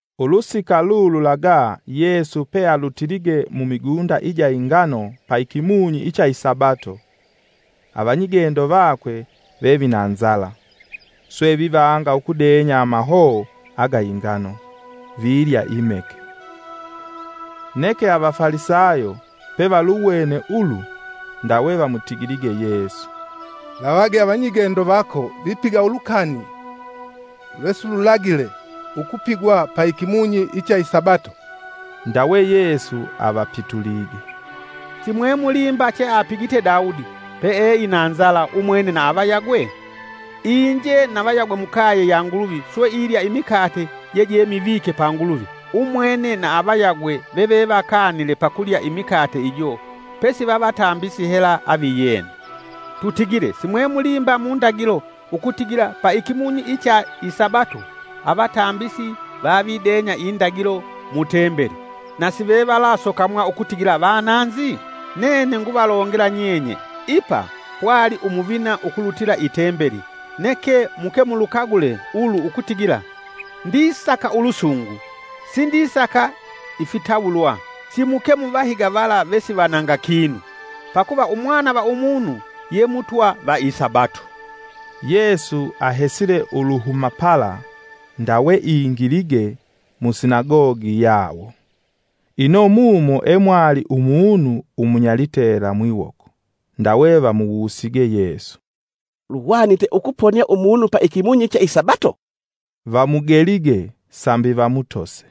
Ulusika lululaga Yesu pealutilige mumigunda ija ingano pa ikimunyi icha isabato; avanyigendo vakwe vevina nzala, swe vivanga ukudenya amahoo aga ingano, vilya imeke. Neke Avafalisayo pevaluwene ulu, ndawe vamutigilige Yesu, “Lavage avanyigendo vako vipiga ulukani lwesilulagile ukupigwa pa ikimunyi icha isabato.” Ndawe Yesu avapitulige, “Simwemulimba che apigite Daudi, pe e ina nzala, umwene na avayagwe? Inje na vayagwe mukaye ya Nguluvi swe ilya imikate jejemivike pa Nguluvi. Umwene na avayagwe vevevakanile pakulya imikate ijo pesi vavatambisi hela aviyena. Tutigile simwemulimba mundagilo ukutigila pa ikimunyi cha isabato avatambisi vavidenya indagilo mutembeli, na sivevalasokamwa ukutigila vananzi? Nene nguvalongela nyenye ipa pwali umuvina ukulutila itembeli. Neke muke mulukagule ulu ukutigila, ‘Ndisaka ulusungu, sindisaka ifitawulwa’ simuke muvahiga vala vesivananga kinu. Pakuva Umwana va Umunu ye Mutwa va isabato.” Yesu ahesile uluhuma pala, ndawe ingilige musinagogi yawo. Ino mumo emwali umunu umunyalitela mwiwoko. Ndawe vamuwusige Yesu, “Luhwanite ukuponia umunu pa ikimunyi cha isabato?” Vamugelige sambi vamutose.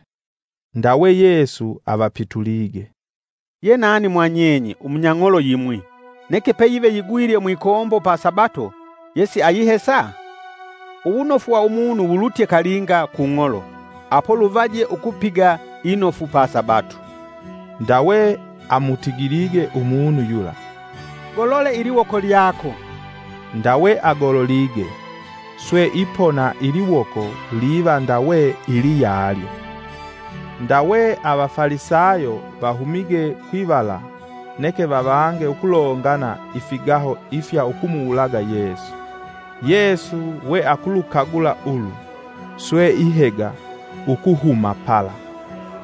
Ndawe Yesu avapitulige, “Yenani mwa nyenye umunya ng'olo yimwi, neke peyive yigwilye mwikombo pa sabato yesiayihesa? Uwunofu wa umunu wulutye kalinga ku ng'olo apo luvaje ukupiga inofu pa Sabato.” Ndawe amutigilige umunu yula, “Golole iliwoko lyako.” Ndawe agololige swe ipona iliwoko liva ndawe iliyalyo. Ndawe Avafalisayo vahumige kwivala neke vavange ukulongana ifigaho ifya ukumuwulaga Yesu. Yesu we akulukagula ulu, swe ihega ukuhuma pala.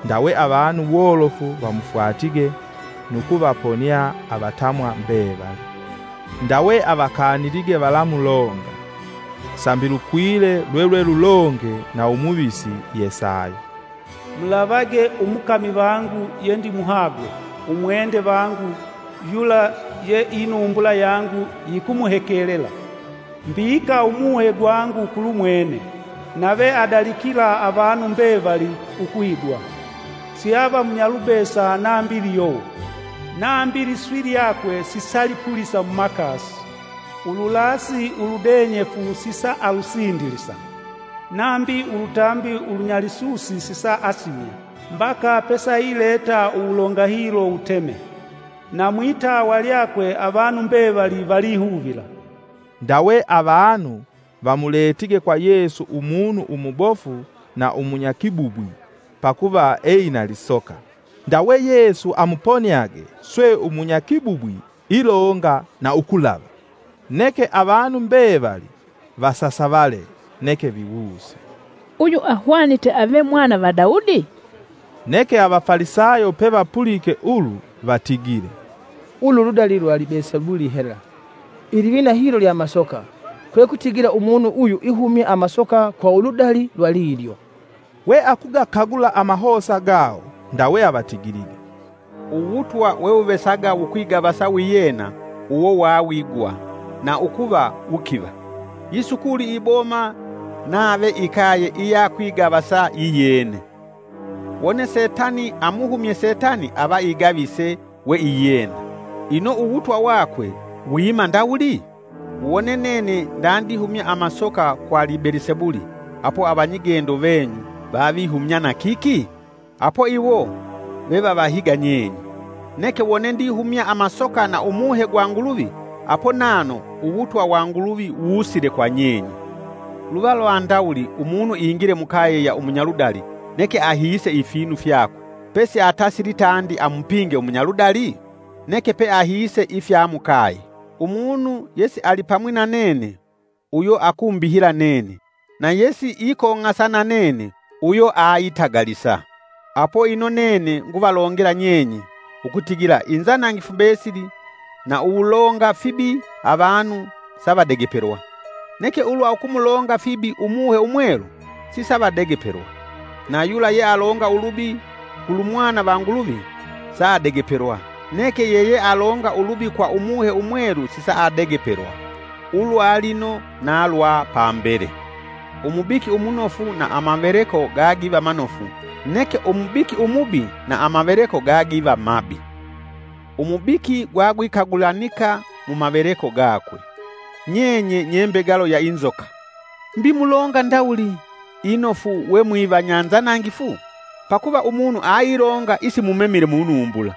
Ndawe avanu wolofu vamufwatige nu kuvaponia avatamwa mbevali. Ndawe avakanilige valamulonga, Sambi lukwile lwelwe lulonge na umuvisi Yesaya; “Mulavage, umukami vangu yendimuhagwe, umwende vangu yula ye inumbula yangu yikumuhekelela. Mbika umuhe gwangu kulumwene, nave adalikila avanu mbevali ukuhigwa. Siava munyalubesa nambi liyowo, nambi liswi lyakwe sisalipulisa mumakasi. Ululasi uludenyefu sisaalusindilisa, nambi ulutambi ulunyalisusi sisaasimya, mbaka pesaileta uwulonga hilo wuteme. Na mwitawa lyakwe avanu mbevali valihuvila.” Ndawe avanu vamuletige kwa Yesu umunu umubofu na umunyakibubwi pakuva eina lisoka, ndawe Yesu amuponiage swe umunyakibubwi ilonga na ukulava. Neke avanu mbevali vasasavale neke viwuse, “Uyu ahwanite ave mwana va Daudi?” Neke Avafalisayo pevapulike ulu vatigile, “Ulu ludali lwa Libelisebuli hela. Ilivina hilo lya amasoka, kwe kutigila umunu uyu ihumya amasoka kwa uludali lwa lilyo.” We akugakagula amahosa gawo, ndawe avatigilige, “Uwutwa wewuvesaga wukwigavasa wiyena uwo wawigwa na ukuva wukiva, yisukuli iboma nave ikaye iyakwigavasa yiyene. Wone setani amuhumye setani ava igavise we iyena; ino uwutwa wakwe wiima ndawuli? Wone nene ndandihumya amasoka kwa Libelisebuli apo avanyigendo venyu vavihumya na kiki? Apo iwo vevavahiga nyenye. Neke wone ndihumya amasoka na Umuhe gwa Nguluvi apo nano uwutwa wa Nguluvi wusile kwa nyenye. “Luva lwa ndawuli umunu ingile mukaye ya umunyaludali neke ahiise ifinu fyakwe, pesiatasili tandi amupinge umunyaludali? Neke pe ahiise ifya mukaye. Umunu yesialipamwi na nene uyo akumbihila nene na yesi ikong'asa na nene uyo aitagalisa. Apo ino nene nguvalongela nyenye, ukutigila inzanangifu mbesili na uwulonga fibi avanu savadegepelwa, neke ulwa ukumulonga fibi Umuhe Umwelu sisavadegepelwa. Na yula yealonga ulubi kulumwana va Nguluvi saadegepelwa, neke yeyealonga ulubi kwa Umuhe Umwelu sisaadegepelwa, ulwa lino na lwa pambele. “Umubiki umunofu na amaveleko gagiva manofu neke umubiki umubi na amaveleko gagiva mabi. Umubiki gwagwikagulanika mumaveleko gakwe. Nyenye nyembegalo ya inzoka! Mbi mulonga ndawuli inofu, we mwivanya nzanangifu? Pakuva umunu ailonga isimumemile munumbula.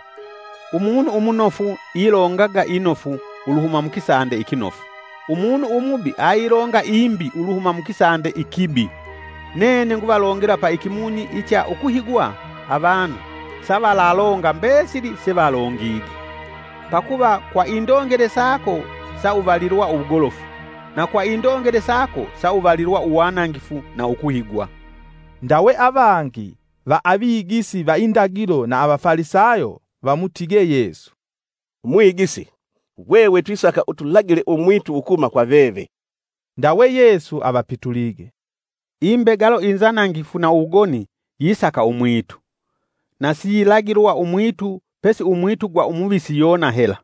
Umunu umunofu ilongaga inofu uluhuma mukisande ikinofu; umunu umubi ailonga imbi uluhuma mukisande ikibi. “Nene nguvalongela pa ikimunyi icha ukuhigwa avanu savalalonga mbesili sevalongige. Pakuva kwa indongele sako sauvalilwa uwugolofu, na kwa indongele sako sauvalilwa uwanangifu na ukuhigwa.” Ndawe avangi va avigisi va indagilo na Avafalisayo vamutige Yesu, “Mwigisi, hwehwe twisaka utulagile umwitu ukuhuma kwa veve.” Ndawe Yesu avapitulige, “Imbegalo inzanangifu na uwugoni yisaka umwitu; na siyilagilwa umwitu pesi umwitu gwa umuvisi Yona hela.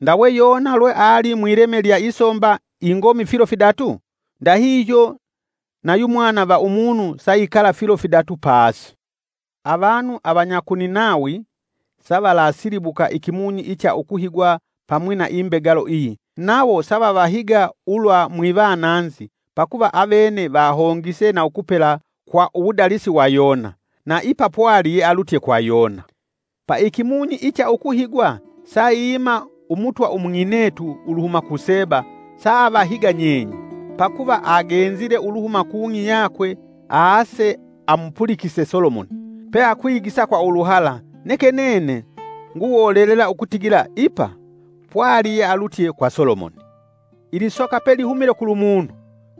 Ndawe Yona lwe ali mwileme lya isomba ingomi filo fidatu, ndahihyo na yu Mwana va Umunu saikala filo fidatu pasi. Avanu avanya ku Ninawi savalasilibuka ikimunyi icha ukuhigwa pamwi na imbegalo iyi, nawo savavahiga ulwa mwivananzi pakuva avene vahongise na ukupela kwa uwudalisi wa Yona; na ipa pwali yealutye kwa Yona. Pa ikimunyi icha ukuhigwa saiima umutwa ung'inetu uluhuma ku Seba saavahiga nyenye. Pakuva agenzile uluhuma kung'i yakwe aase amupulikise Solomoni, peakwigisa kwa uluhala neke nene nguwolelela ukutigila ipa, pwali yealutye kwa Solomoni. “Ilisoka pelihumile kulumunu,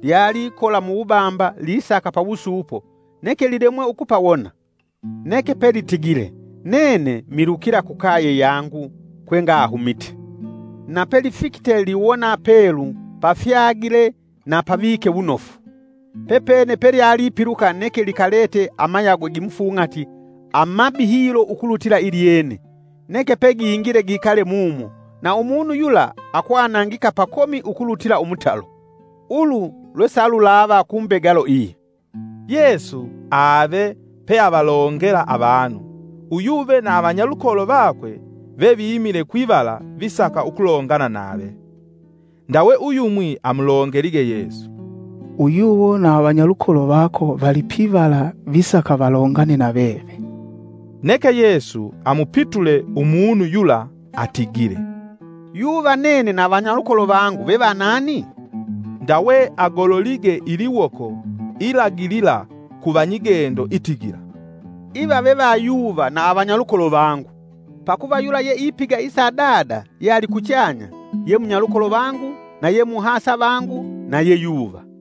lyalikola muwubamba lisaka pawusuupo neke lilemwe ukupawona. Neke pelitigile, ‘Nene milukila kukaye yangu kwengahumite.’ Napelifikite liwona pelu pafyagile na pavike wunofu, pepene pelyalipiluka neke likalete amayagwe gimufung'ati amabi hilo ukulutila ilyene, neke pegingile gikale mumo; na umunu yula akwanangika pakomi ukulutila umutalo. Ulu lwe salulava ku mbegalo iyi.” Yesu ave peavalongela avanu, uyuve na avanyalukolo vakwe veviimile kwivala visaka ukulongana nave. Ndawe uyumwi amulongelige Yesu, “Uyuwo na avanyalukolo vako vali pivala visaka valongane na veve.” Neke Yesu amupitule umunu yula atigile, “Yuva nene na vanyalukolo vangu vevanani?” Ndawe agololige iliwoko ilagilila ku vanyigendo itigila, “Iva ve vayuva na avanyalukolo vangu! Pakuva yula yeipiga isa Dada yealikuchanya ye munyalukolo vangu na yemuhasa vangu na ye yuva.”